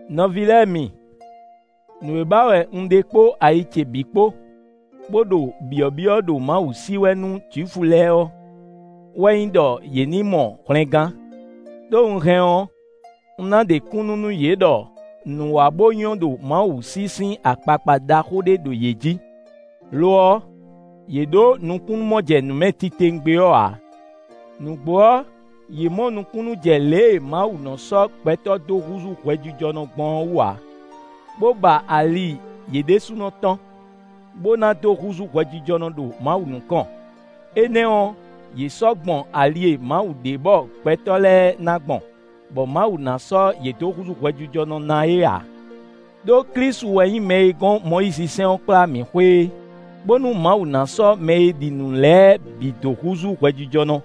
Nɔví lɛ́ɛ mi, nǔ e ba wɛ un ɖe kpó ayi ce bǐ kpó, bó ɖo byɔ̌byɔ́ ɖo Mawu sí wɛ nú Jwifu lɛ́ɛ ɔ́, wɛ nyí ɖɔ yě ní mɔ hwlɛngán. Đó un hɛn ɔ́, un ná ɖe kúnnu nú yě ɖɔ nǔ wa bó nyɔ́ ɖo Mawu sí sín akpakpa ɖaxó ɖé ɖo yě jí; lo ɔ́, yě ɖǒ nukúnnú-mɔjɛnǔmɛ titewungbe ɔ́ ǎ. Nǔgbó ɔ́, yě mɔ nukúnnú jɛ lě e Mawu nɔ sɔ́ gbɛtɔ́ dó húzú hwɛjijɔnɔ gbɔn ɔ́ wú ǎ, bó ba ali yě ɖésúnɔ tɔn, bó ná dó húzú hwɛjijɔnɔ ɖo Mawu nukɔn; énɛ́ ɔ́, yě sɔ́ gbɔn ali e Mawu ɖe bɔ gbɛtɔ́ lɛ́ɛ ná gbɔn, bɔ Mawu ná sɔ́ yě dó húzú hwɛjijɔnɔ ná é ǎ. Đó Klísu wɛ nyí mɛ e gɔ́n Mɔyízisɛ́n ɔ́ kplá mǐ xwe é, bónú Mawu ná sɔ́ mɛ e ɖi nǔ lɛ́ɛ bǐ dó húzú hwɛjijɔnɔ.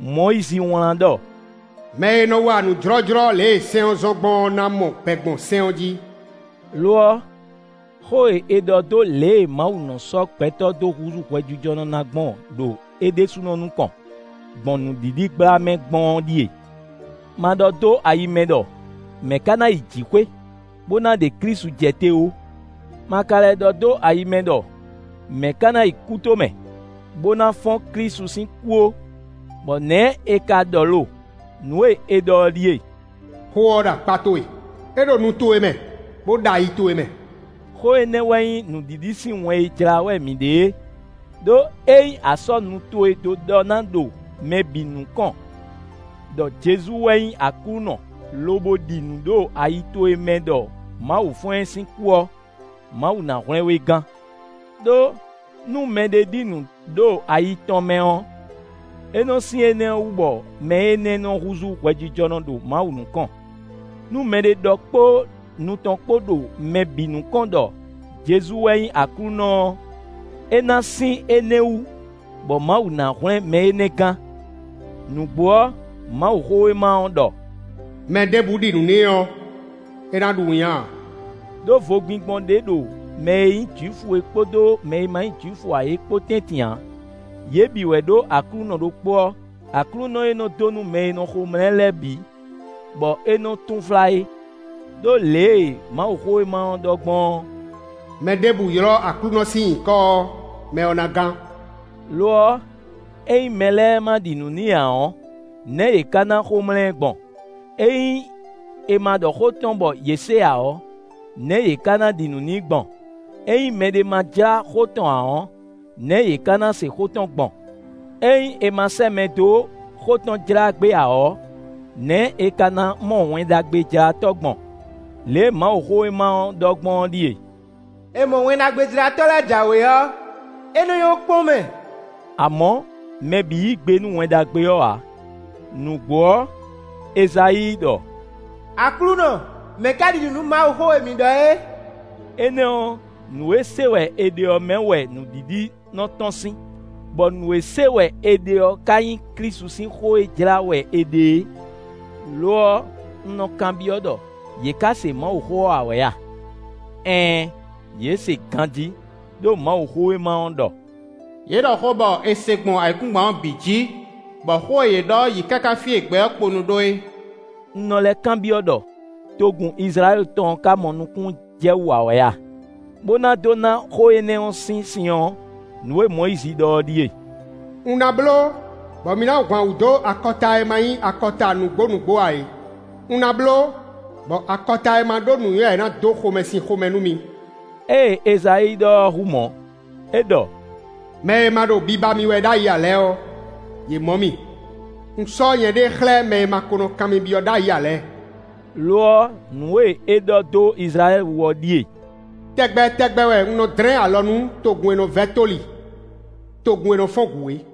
Mɔyízi wlán ɖɔ: “Mɛ e nɔ wa nǔ jlɔ́jlɔ́ lě e sɛ́n ɔ́ zɔ́n gbɔn ɔ́ ná mɔ gbɛ gbɔn sɛ́n ɔ́ jí.” Lo ɔ́, xó e è ɖɔ dó lě e Mawu nɔ sɔ́ gbɛtɔ́ dó húzú hwɛjijɔnɔ ná gbɔn ɖo é ɖésúnɔ nukɔn, gbɔn nǔɖiɖi gbla mɛ gbɔn ɔ́ ɖíe: “Ma ɖɔ dó ayi mɛ ɖɔ: ‘Mɛ̌ ka ná yi jǐxwé?’ (Bó ná ɖe Klísu jɛ te ó.) Ma ka lɛ́ ɖɔ dó ayi mɛ ɖɔ: ‘Mɛ̌ ka ná yi kútomɛ?’ (Bó ná fɔ́n Klísu sín kú) ó.” Bɔ nɛ̌ è ka ɖɔ lo? Nǔ e è ɖɔ ɔ́ ɖíe: “Xó ɔ́ ɖo akpá towe; é ɖo nu towe mɛ, bó ɖo ayi towe mɛ.” Xó énɛ́ wɛ nyí nǔɖiɖi sín wɛn e jlá wɛ mǐ ɖe é. Đó ényí a sɔ́ nu towe dó ɖɔ ná ɖo mɛ bǐ nukɔn ɖɔ Jezu wɛ nyí Aklúnɔ lobo ɖi nǔ ɖo ayi towe mɛ ɖɔ Mawu fɔ́n ɛ sín kú ɔ́, Mawu ná hwlɛ́n we gán. Đó, nú mɛɖé ɖi nǔ ɖo ayi tɔn mɛ ɔ́, é nɔ sín énɛ́ wú bɔ mɛ énɛ́ nɔ húzú hwɛjijɔnɔ ɖo Mawu nukɔn. Nú mɛɖé ɖɔ kpó nu tɔn kpó ɖo mɛ bǐ nukɔn ɖɔ Jezu wɛ nyí Aklúnɔ ɔ́, é ná sín énɛ́ wú bɔ Mawu ná hwlɛ́n mɛ énɛ́ gán. Nǔgbó ɔ́, Mawuxówéma ɔ́ ɖɔ: “Mɛɖěbǔ ɖi nǔ n'i ɔ́, é ná ɖu winnyá ǎ.” Đó vogbingbɔn ɖé ɖo mɛ e nyí Jwifu é kpódó mɛ e ma nyí Jwifu ǎ é kpo tɛ́ntin ǎ; yě bǐ wɛ ɖó Aklúnɔ ɖokpó ɔ́; Aklúnɔ e nɔ dó nú mɛ e nɔ xomlá ɛ lɛ́ɛ bǐ, bɔ é nɔ túnflá é. Đó lě e Mawuxówéma ɔ́ ɖɔ gbɔn ɔ́: “Mɛɖěbǔ ylɔ́ Aklúnɔ sín nyǐkɔ ɔ́, mɛ ɔ́ ná gán.” Lo ɔ́, ényí mɛ lɛ́ɛ ma ɖi nǔ n'i ǎ ɔ́, nɛ̌ yě ka ná xomlá ɛ gbɔn? Ényí è ma ɖɔ xó tɔn bɔ yě se ǎ ɔ́, nɛ̌ yě ka ná ɖi nǔ n'i gbɔn? Ényí mɛɖé ma jlá xó tɔn ǎ ɔ́, nɛ̌ yě ka ná se xó tɔn gbɔn? Ényí è ma sɛ́ mɛ dó xó tɔn jlá gbé ǎ ɔ́, nɛ̌ è ka ná mɔ Wɛn Ɖagbejlátɔ́ gbɔn? Lě e Mawuxówéma ɔ́ ɖɔ gbɔn ɔ́ ɖíe: “È mɔ Wɛn Ɖagbejlátɔ́ lɛ́ɛ jǎwe ɔ́, é nɔ nyɔ́ kpɔ́n mɛ.” Amɔ̌, mɛ bǐ yí gbe nú Wɛn Ɖagbe ɔ́ ǎ. Nǔgbó ɔ́, Ezayíi ɖɔ: “Aklúnɔ, mɛ̌ ka ɖi nǔ nú Mawuxó e mǐ ɖɔ é?” Énɛ́ ɔ́, nǔ e se wɛ è ɖe ɔ́ mɛ wɛ nǔɖiɖi nɔ tɔ́n sín, bɔ nǔ e se wɛ è ɖe ɔ́ ka nyí Klísu sín xó e jlá wɛ è ɖe é. Lo ɔ́, un nɔ kanbyɔ́ ɖɔ: “Yě ka se Mawuxó ɔ́ ǎ wɛ a?” Ɛɛn, yě se ganjí. Đó Mawuxówéma ɔ́ ɖɔ: “Yě ɖɔ xó bɔ è se gbɔn ayǐkúngban ɔ́ bǐ jǐ, bɔ xó e yě ɖɔ ɔ́ yi káká fí e gbɛ ɔ́ kponu ɖó é.” Un nɔ lɛ́ kanbyɔ́ ɖɔ: “Togun Izlayɛ́li tɔn ɔ́ ka mɔ nukúnnú jɛ wú ǎ wɛ a?” Bó ná dó ná xó énɛ́ ɔ́ sín sin ɔ́, nǔ e Mɔyízi ɖɔ ɔ́ ɖíe: “Un ná bló bɔ mi ná hwan wǔ dó akɔta e ma nyí akɔta nǔgbó nǔgbó ǎ é. Un ná bló bɔ akɔta e ma ɖó nǔnywɛ́ ǎ é ná dó xomɛsin xomɛ nú mi.” Ée Ezayíi ɖɔ ɔ́ hú mɔ̌; é ɖɔ: “Mɛ e ma ɖo biba mì wɛ ɖ'ayǐ ǎ lɛ́ɛ ɔ́, yě mɔ mì. Un sɔ́ nyɛɖée xlɛ́ mɛ e ma ko nɔ kan mì byɔ́ ɖ'ayǐ ǎ lɛ́ɛ.” Lo ɔ́, nǔ e é ɖɔ dó Izlayɛ́li wú ɔ́ ɖíe: “Tɛgbɛ tɛgbɛ wɛ un nɔ dlɛ́n alɔ nú togun e nɔ vɛ́ tóli, togun e nɔ fɔ́n gǔ é.”